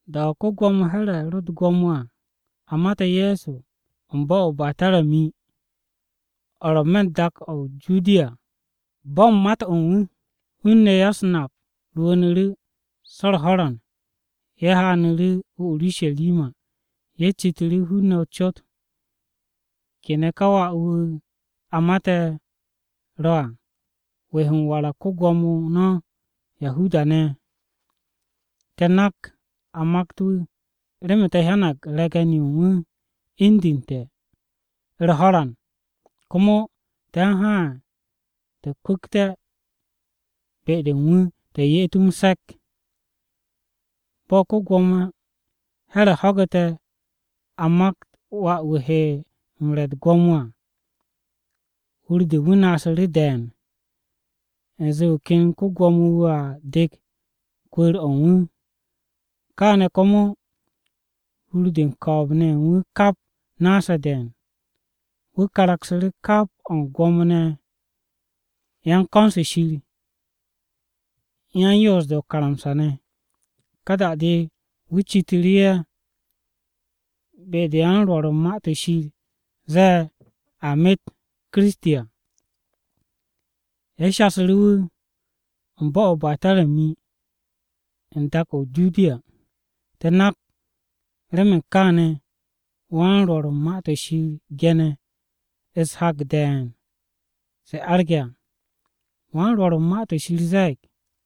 Da-o̱ ko-Gwo̱mo Here̱ ro u̱t-gwo̱mo à, a mate̱ Ye̱so u̱n bo̱-o̱ o-Be̱tarami, o̱ ro̱ n-me̱ u̱n dak-o̱ o-Judiya à. Bo̱ u̱n mat u̱n wu̱, hun-ne̱ ya-u̱s-nap rwu̱u̱nu̱ru̱ so̱ u̱r-ho̱ran ye̱ haanu̱ru̱ o-Urusharima. Ye̱ citu̱ru̱ hun-ne̱ o-cot, “¿Kene̱ ka wà-wu̱ a mate̱ à ro̱, wu̱ he m-warag ko-Gwo̱mo no̱ Yahuda-ne̱ à? Te̱ nak a makt wu̱ remen te̱ hyanag re̱ge̱n-yo u̱n wu̱ indu̱nte̱ u̱r-ho̱ran, komo te̱ u̱n haan, te̱ kwu̱kte̱ be-de u̱n wu̱, te̱ ye'et wu̱ m-se̱k.” Bo̱ ko-Gwo̱mo Here̱ ho̱gu̱te̱ a makt wà-wu̱ he m-re̱ u̱t-gwo̱mo à, hur-de u̱n wu̱ naasu̱ru̱ de̱e̱n, u̱nze wu̱ ken ko-Gwo̱mo wu̱a dek kwu̱u̱r-o̱ u̱n wu̱. Kaane̱ komo hur-de u̱n ko̱o̱b-ne̱ ye̱ u̱n wu̱ kap naase̱ de̱e̱n. Wu̱ karaksu̱ru̱ kap o̱ u̱n Gwo̱mo-ne̱ ye̱ u̱n ko̱n-se Shir u̱n yan-Yoos-de o-karamsa ne̱. Ka da-de wu̱ citu̱ru̱ ye̱ be-de yan-Rwo̱r u̱n Ma-to̱ Shir zee a met Kiristi à. Ye̱ shasu̱ru̱ wu̱, “U̱n bo̱-o̱ o-Be̱tarami, n-me̱ u̱n dak-o̱ o-Judiya. Te̱ nak remen kaane̱ wan-Rwo̱r u̱n Ma-to̱ Shir ge̱ne̱ u̱s-hak de̱e̱n se arge̱ à, wan-Rwo̱r u̱n Ma-to̱ Shir ze̱e̱g: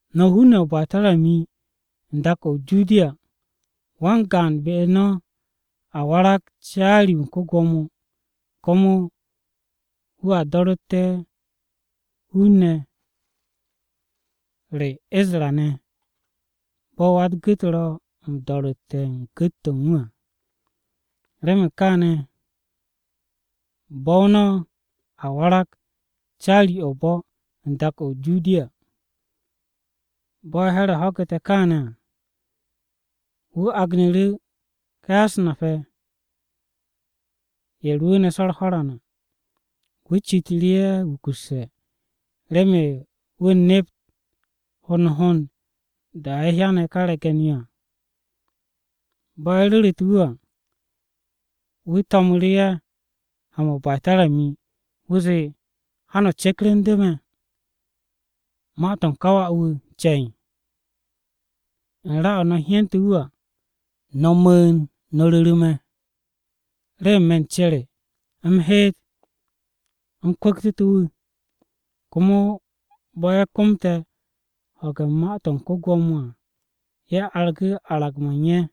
“ ‘No̱ hun-ne̱ ye̱ o-Be̱tarami u̱n dak-o̱ o-Judiya, wan-gaan be-u̱r no̱ a warag caari-wu̱ u̱n ko-Gwo̱mo, Komo wu̱a do̱ru̱tte̱ hun-ne̱ re Isra-ne̱ bo̱ wa-u̱t-gu̱t ro̱ m-do̱ru̱tte̱ u̱n gu̱t-to̱ u̱n wu̱ à. Remen kaane̱ bo̱-o no̱ a warag caari-o̱ o-bo̱ u̱n dak-o̱ o-Judiya.’” Bo̱ Here̱ ho̱ge̱ kaane̱ à, wu̱ agnu̱ru̱ ká ya-u̱s-nap-ye̱, ye̱ rwu̱u̱ne̱ so̱ u̱r-ho̱ran à. Wu̱ citu̱ru̱ ye̱ wukusse̱, remen wu̱ nept hond hond da-o̱ ye̱ hyane̱ ká re̱ge̱n-yo à. Bo̱ ye̱ ru̱ru̱te̱ wu̱ à, wu̱ to̱mu̱ru̱ ye̱ ha-mo̱ o-Be̱tarami, wu̱ zee, “Ha no̱ cekrendu̱ me̱ ma-to̱ u̱n ká wà-wu̱ ce̱e̱n. U̱n ra-o̱ no̱ hyente̱ wu̱ à, no̱ mu̱u̱n, no̱ ru̱ru̱ me̱, remen me̱ u̱n ce re u̱m heet m-kwu̱ktu̱ wu̱.” Komo bo̱ ye̱ komte̱ ho̱ge̱ u̱n ma-to̱ u̱n ko-Gwo̱mo à, ye̱ argu̱ arag-mo̱ u̱n ye̱.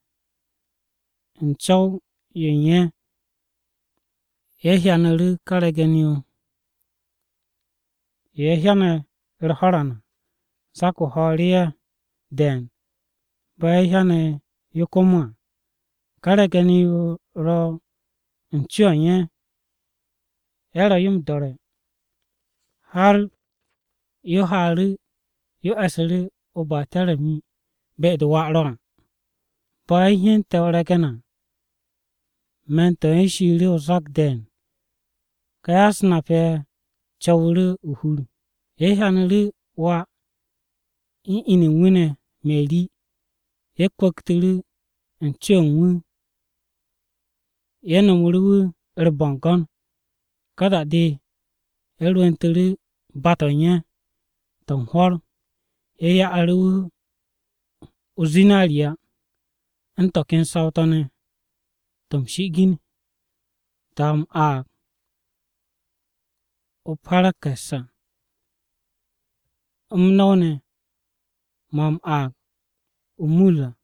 U̱n co̱w-yo u̱n ye̱, ye̱ hyanu̱ru̱ ká re̱ge̱n-yo, yo ye̱ hyane̱ u̱r-ho̱ran à. Zak-o ho̱o̱ru̱ ye̱ de̱e̱n bo̱ ye̱ hyane̱ yo komo à. Ká re̱ge̱n-yo ro̱ u̱n co-o̱ u̱n ye̱, ye̱ ro̱ yo m-do̱re̱ har yo haaru̱ yo e̱su̱ru̱ o-Be̱tarami be-de wà ro à. Bo̱ ye̱ hyente̱ o-re̱ge̱n à, me̱n-to̱ u̱n ye̱ shiiru̱ o-zak de̱e̱n. Ka ya-u̱s-nap-ye̱ co̱wu̱ru̱ o-hur. Ye̱ hyanu̱ru̱ wà u̱n inu u̱n wu̱ ne̱ Meri, ye̱ kwu̱ktu̱ru̱ u̱n co-o̱ u̱n wu̱, ye̱ nomu̱ru̱ wu̱ u̱r-bo̱ngo̱n. Ka da-de, ye̱ rwu̱ntu̱ru̱ ba-to̱ u̱n ye̱, to̱ u̱n hwo̱r. Ye̱ ya'u̱ru̱ wu̱ o-zinariya, u̱n to̱ ken saw-to̱ m-shi'igin to̱ ne̱ to̱, a m-aag “u̱t-parakanse à” u̱n m-no̱w ne̱ mo̱ a m-aag “o-mur” ne̱ à.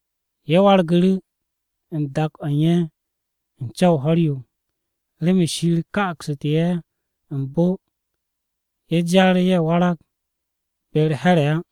Ye̱ wargu̱ru̱ u̱n dak-o̱ u̱n ye̱ u̱n co̱w-o ho̱r-yo, remen Shir ka'aksu̱tu̱ ye̱ m-bo ye̱ jar ye̱ warag be-u̱r Here̱ á.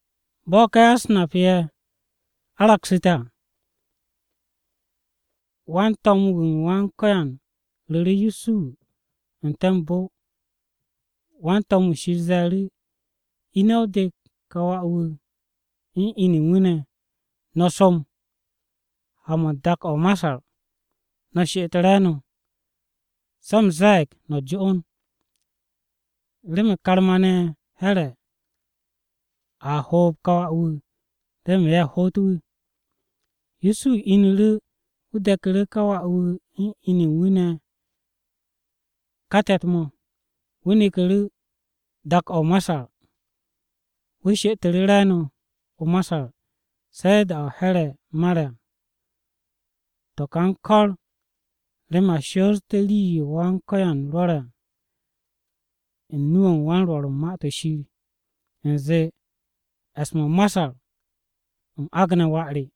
Bo̱ ka ya-u̱s-nap-ye̱ aragsu̱te̱ à, wan-to̱m-wu̱ Wan-Ko̱yan ru̱ru̱ Yusuhu n-te̱ m-bo, wan-to̱m-wu̱ Shir ze̱e̱ru̱, “Ine̱, o dek ka wà-wu̱ u̱n inu u̱n wu̱ ne̱, no̱ som ha-mo̱ u̱n dak-o̱ o-Masar. No̱ she'et re̱e̱no̱, se̱ u̱m ze̱e̱g no̱ jo'on, remen karma-ne̱ Here̱ a hoob ka wà-wu̱, remen ye̱ hoot wu̱.” Yusuhu inu̱ru̱ wu̱ de̱ku̱ru̱ ká wà-wu̱ u̱n inu u̱n wu̱ ne̱ ká te̱t-mo̱, wu̱ neku̱ru̱ dak-o̱ o-Masar. Wu̱ she'etu̱ru̱ re̱e̱no̱ o-Masar se̱ da-o̱ Here̱ mare̱ à. To̱ ka u̱n kor remen a shoote̱ rii-yo Wan-Ko̱yan rwo̱re̱ à u̱n nu-o̱ u̱n wan-Rwo̱r u̱n Ma-to̱ Shir u̱nze, “E̱s-mo̱ o-Masar u̱m agne̱ wà re.”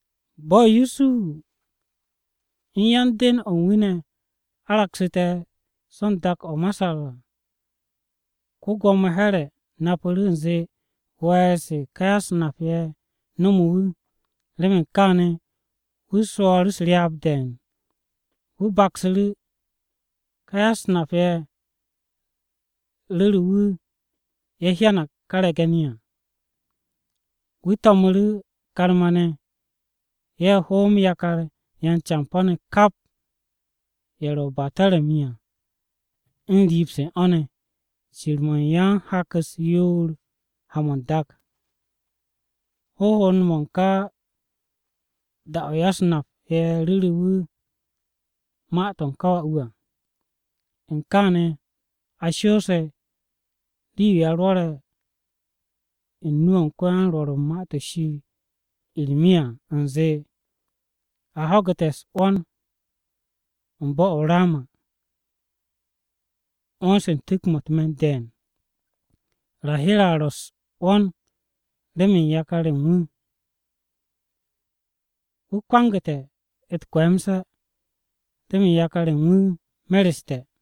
Bo̱ Yusuhu u̱n ya-den-o̱ u̱n wu̱ ne̱ aragsu̱te̱ so u̱n dak-o̱ o-Masar à, ko-Gwo̱mo Here̱ napu̱ru̱ u̱nze we̱e̱r-se ká ya-u̱s-nap-ye̱ nomo wu̱. Remen kaane̱ wu̱ swo̱o̱ru̱ u̱s-ryaab de̱e̱n. Wu̱ baksu̱ru̱ da-o̱ ká ya-u̱s-nap-ye̱ ru̱re̱ wu̱ ye̱ hyanag ka re̱ge̱n-yo à. Wu̱ to̱mu̱ru̱ karma-ne̱ ye̱ hoom yakar yan-campo̱-ne̱ kap ye̱ ro̱ o-Be̱tarami à u̱n riib-se u̱n o̱ ne̱, cir-mo̱ u̱n yan-hak-u̱s yoor ha-mo̱ n-dak, hond hond-mo̱ u̱n ká da-o̱ ya-u̱s-nap-ye̱ ru̱ru̱ wu̱ ma-to̱ u̱n ká wà-wu̱ à. U̱n kaane̱ a shoose̱ rii-yo a rwo̱re̱ u̱n nu-o̱ u̱n ko-yan-Rwo̱r u̱n Ma-to̱ Shir Irmiya, u̱nze, “A ho̱gu̱te̱ u̱s-'wo̱n u̱n bo̱-o̱ o-Rama, 'wo̱n-se u̱n tu̱k-mo̱ u̱t-me̱n de̱e̱n. Rahira ro̱ u̱s-'wo̱n remen yakar-ye̱ u̱n wu̱, Wu̱ kwangu̱te̱ u̱t-kwe̱e̱mse̱ remen yakar-ye̱ u̱n wu̱ mereste̱.”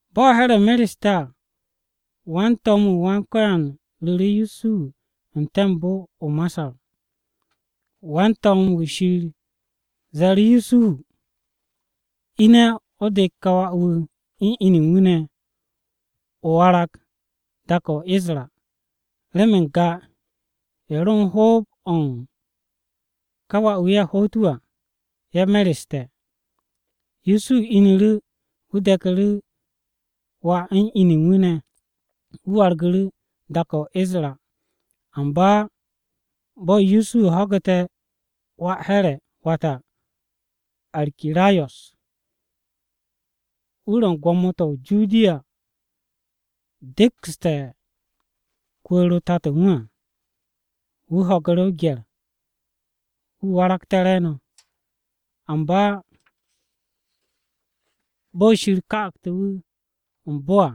Bo̱ Here̱ mereste̱ à, wan-to̱m-wu̱ Wan-Ko̱yan ru̱ru̱ Yusuhu n-te̱ m-bo o-Masar, wan-to̱m-wu̱ Shir ze̱e̱ru̱ Yusuhu: “Ine̱, o dek ka wà-wu̱ u̱n inu u̱n wu̱ ne̱, o warag dak-o̱ o-Isra, remen n-ga ye̱ ro u̱n hoob-o̱ u̱n wà ye̱ hoot wu̱ à, ye̱ mereste̱.” Yusuhu inu̱ru̱, wu̱ deku̱ru̱ wà u̱n inu u̱n wu̱ ne̱, wu̱ wargu̱ru̱ dak-o̱ o-Isra. Amba bo̱ Yusuhu ho̱gu̱te̱ wà Here̱, wata, Arkirayo̱s wu̱ ro̱ u̱n gwo̱mo-to̱ o-Judiya dekste̱ kwu̱u̱r-o Tato u̱n wu̱ à, wu̱ ho̱gu̱ru̱ o-gye̱r wu̱ waragte̱ re̱e̱no̱. Amba bo̱ Shir ka'aktu̱ wu̱ u̱n m-bo à,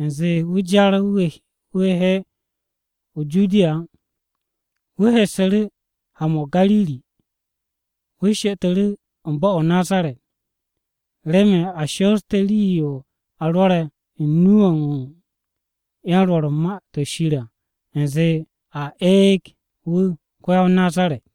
u̱nze wu̱ jar wu̱ he o-Judiya á wu̱ hessu̱ru̱ ha-mo̱ o-Gariri. Wu̱ she'etu̱ru̱ u̱n bo̱-o̱ o-Nazaret, remen a shoosté̱ rii-yo a rwo̱re̱ u̱n nu-o̱ u̱n yan-Rwo̱r u̱n Ma-to̱ Shir à u̱nze, “A eeg wu̱ ko-ya-o-Nazaret.”